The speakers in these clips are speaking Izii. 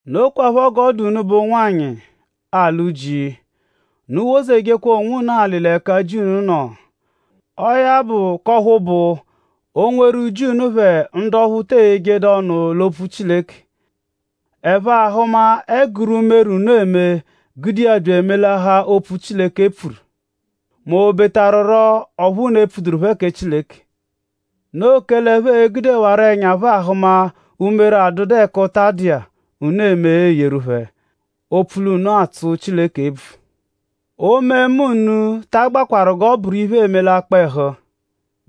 Nokwaphọ g'ọ dụ unubẹ ụnwanyi, alụ ji. Unu wozejekwa onwunu alị l'ẹka ji unu nọ. Ọo ya bụ k'ọphu bụ; o -nweru ji unu phẹ ndu ọphu te eyejedu ọnu l'opfu Chileke; ẹphe ahụma ẹguru umere, unu eme gude iya bya emelahaa opfu, Chileke pfuru; m'obetarurọ ọphu unu epfuduru phẹ kẹ Chileke. Noo kẹle ẹphe e-gudewarọ ẹnya phẹ ahụma umere, adụdu ẹka ụta dụ iya, unu eme eyeru phẹ; opfu l'unu atsụ Chileke ebvu. Omemma unu ta agbakwarụ g'ọ bụru iphe, eme l'akpọ-ẹhu,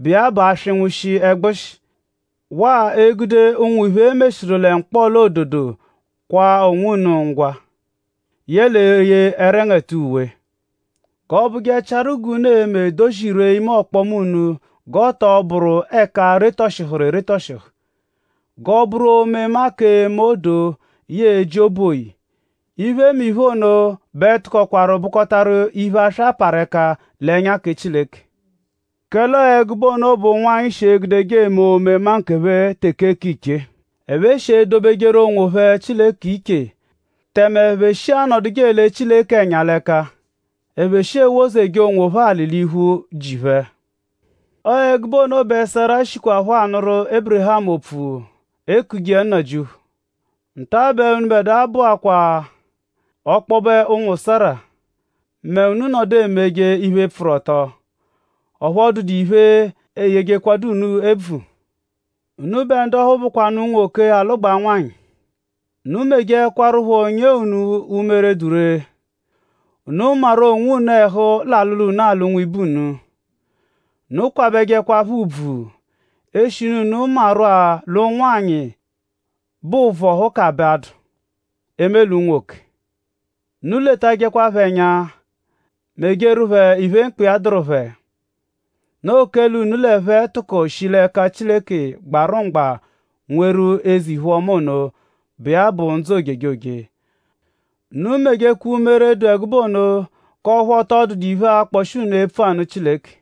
bụ iya bụ aswịngashi ẹgbushi; waa egude ụnwu iphe, e meshiru lẹ mkpọla-ododo kwaa onwunu ngwa; yẹle eye ẹrengete uwe. G'ọ bụjechiaru g'unu e-me dozirwee ime ọkpoma unu g'ọ tọ bụru ẹka retọshihuru eretọshihu; g'ọ bụru omemma k'eme odoo yẹe eji obu oyi. Iphemiphe ono bẹ tụkokwaru bụkotaru iphe, aswa parụ ẹka l'ẹnya kẹ Chileke. Kẹle ọo ẹgube ono bụ g'ụnwanyi shi egudeje eme omemma nkephẹ teke k'ichee. Ẹphe shi edobejeru onwophẹ Chileke iche; tẹme ẹphe shi anọduje ele Chileke ẹnya l'ẹka. Ẹphe shi ewozeje onwophẹ alị l'iphu ji phẹ. Ọo ẹgube ono bẹ Sera shikwaphọ anụru Ébirihamu opfu ekuje iya nnajịuphu. Nta-a bẹ unubẹdua bụakwaa ọkpobe ụnwu Sera mẹ unu -nọdu emeje-a iphe, pfụru ọto; ọphu ọ dụdu iphe, eyejekwadu unu ebvu. Unubẹ ndu ọphu bụkwanu unwoke, alụgbaa nwanyị; unu mejekwaruphọ nyee unu umere, dụ ree. Unu maru onwunu ẹhu l'alụlu, unu alụ nwibe unu. Unu kwabẹjekwa phẹ ùbvù; eshinu unu maanarụ-a l'ụnwanyi bẹ ụvohu ka b'adụ; eme lẹ nwoke. Unu letajẹ phẹ ẹnya; mejeru phẹ iphe, mkpa iya dụru phẹ. Noo kẹle unu l'ẹphe a-tụko shi l'ẹka Chileke gbarụ mgba nweru eze-iphe-ọma ono, bụ iya bụ ndzụ ojejoje. Unu mejekwa umere, dụ ẹgube ono k'ọphu ọ tọ dụdu iphe, akpọshi unu epfu anụ Chileke.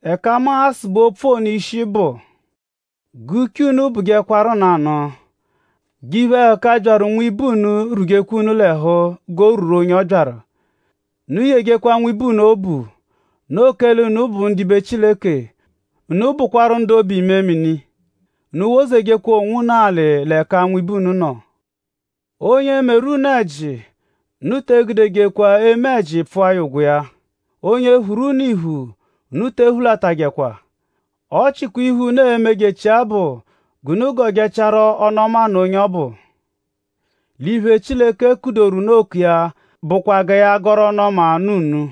Ẹka mu a-sụbe opfu ono ishi bụ; g'uche unu bụjekwaru nanụ. G'iphe-ẹhuka, byaru nwibe unu rwuje unu l'ẹhu g'o rwuru onye ọ byaru. Unu yejekwa nwibe unu obu. Noo kẹle unu bụ ndibe Chileke. Unu bụkwaru ndu obu-imemini. Unu wozejekwa onwunu alị l'ẹka nwibe unu nọ. Onye -meru unu ẹji; unu te egudejekwa eme ẹji pfụa ya ụgwo iya. Onye -phuru unu iphu; unu te ephulatajẹkwa. Ọ chikwaa iphe, unu e-mejechia bụ g'unu gọjechiaru ọnu-ọma nụ onye ọbu. L'iphe, Chileke kudoru unu oku iya bụkwa gẹ ya gọru ọnu-ọma nụ unu.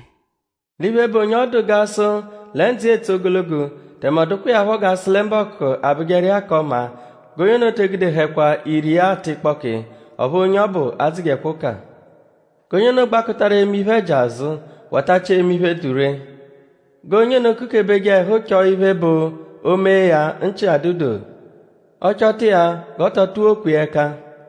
“L'iphe, bụ onye ọ dụ g'a sụ lẹ ndzụ iya e-tse ogologo; tẹme ọ dụkwa iya phọ g'a sụ lẹ mbọku-mbọku abụjeru iya k'ọma; g'onye ono te egudehẹkwa ire iya tụ ịkpoki; ọphu onye ọbu adzụjekwa ụka. G'onye ono gbakụtaru eme iphe-ẹji azụ watachia eme iphe, dụ ree. G'onye ono kukebeje ẹhu chọ iphe, bụ o -mee ya nchị-adụ-doo. Ọ -chọta iya g'ọ tọ tụwokwa iya ẹka.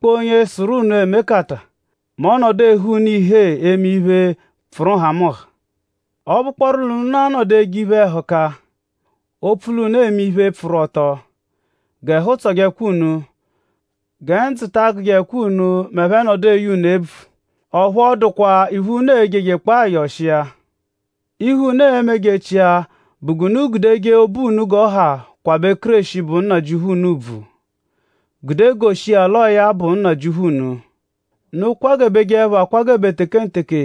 Sụ-a;?dẹnukpoo onye sụru unu emekata mẹ ọ -nọdu ehe unu ihee eme iphe, pfụru nhamụnha? Ọ -bụkpooru nụ l'unu a-nọdu eje iphe-ẹhuka; opfu l'unu eme iphe, pfụru-ọto; g'ẹhu tsọjekwa unu. Gẹ ndzụ ta agụjekwa unu m'ẹphe -nọdu eye unu ebvu; ọphu ọ dụkwa iphe, unu ejejekpọo ayọ ọshi iya. Iphe, unu e-mejechia bụ g'unu gudeje obu unu g'ọ ha kwabẹje Kéreshi, bụ Nnajịuphu unu ùbvù; gude goshi iya l'ọo ya bụ Nnajịuphu unu. Unu kwagebejẹpho akwagebe tekenteke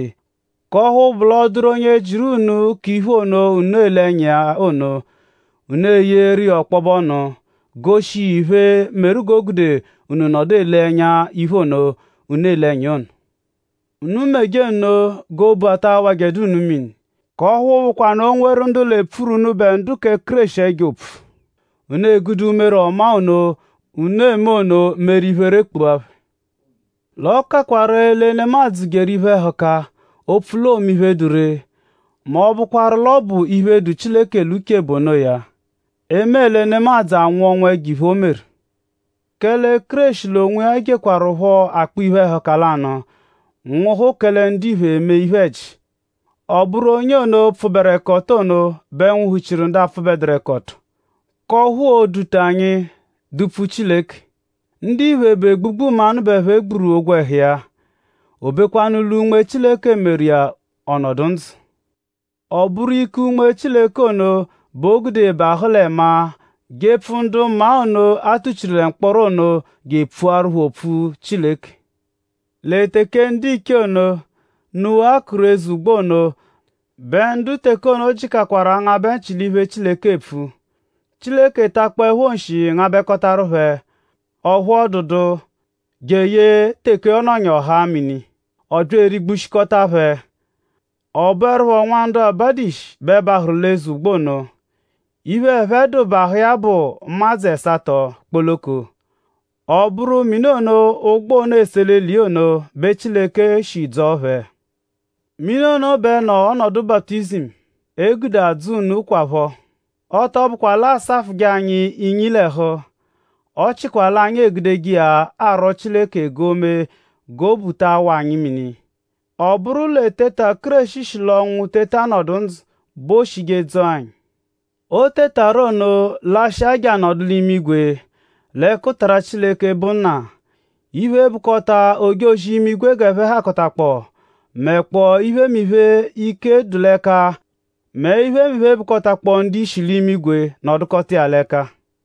k'ọphu bụ l'ọ -dụru onye jịru unu k'iphe ono, unu ele ẹnya iya ono; unu eyeeru iya ọkpobe ọnu; goshi iya iphe, meru g'o gude unu nọdu ele ẹnya iphe ono, unu ele ẹnya iya ono. Unu meje nno g'obu ataa awajẹkwanu unu mini; k'ọphu bụkwanu o -nweru ndu l'epfuru unubẹ ndu kẹ Kéreshi ẹjo opfu; unu egude umere ọma ono, unu eme ono meru iphere kpua phẹ. L'ọ kakwa ree lẹ nemadzụ jeru iphe-ẹhuka; opfu l'oome iphe, dụ ree; m'ọ -bụkwaru l'ọ bụ iphe, dụ Chileke l'uche bụ onoya; eme lẹ nemadzụ anwụ ọnwu ẹjo-iphe, o meru. Kẹle Kéreshi l'onwiya jekwarụpho akpọ iphe-ẹhuka lanụ nwụhu kẹle ndiphe eme iphe-ẹji. Ọ bụru onye ono, pfụberekoto ono bẹ nwụhu-chiru ndu apfụbeduru-ẹka-ọto; k'ọphu oo-duta anyi dupfu Chileke. Ndiphe bụ egbugbu mmanụ bẹ ẹphe gburu ogwẹhu iya. Obekwanu lẹ Unme Chileke meru iya ọ nọdu ndzụ. Ọ bụru ike Unme Chileke ono bẹ o gude bahụ lẹ maa jepfu ndu maa ono, a tuchiru lẹ mkpọro ono je epfuaru phẹ opfu Chileke. Lẹ teke ndiche ono, Nuwa kụru eze ụgbo ono bẹ ndu teke ono jịkakwaru angabẹ nchị l'iphe, Chileke epfu; Chileke takpọepho nshi ngabẹkotaru phẹ; ọphu ọ dụdu; jeye teke ọ nọnyaru ọ haa mini; ọ bya erigbushikọta phẹ. Ọ bụerupho nwa ndu abadu ishi bẹ bahụru l'eze ụgbo ono; iphe, ẹphe dụ bahụ iya bụ ụmadzu ẹsato kpoloko. Ọ bụru mini ono, ụgbo ono ese eli l'eli iya ono bẹ Chileke shi dzọo phẹ. Mini ono bẹ nọ ọnodu baputizimu, e gude adzọ unu kwaphọ. Ọ tọ bụkwa l'a asafụje anyi inyi l'ẹhu; ọ chịkwa l'anyi egudeje iya arwọ Chileke g'o mee g'obu ta awa anyi mini. Ọ bụru l'eteta, Kéreshi shi l'ọnwu teta nọdu ndzụ bẹ ooshije dzọo anyi. O tetaru ono lashịa je anọdu l'imigwe l'ẹkutara Chileke, bụ Nna. Iphe, bụkota ojozi-imigwe g'ẹphe hakọtakpoo; mẹkpoo iphemiphe, ike dụ l'ẹka; mẹ iphemiphe, bụkotakpoo ndu-ishi l'imigwe nọdukota iya l'ẹka.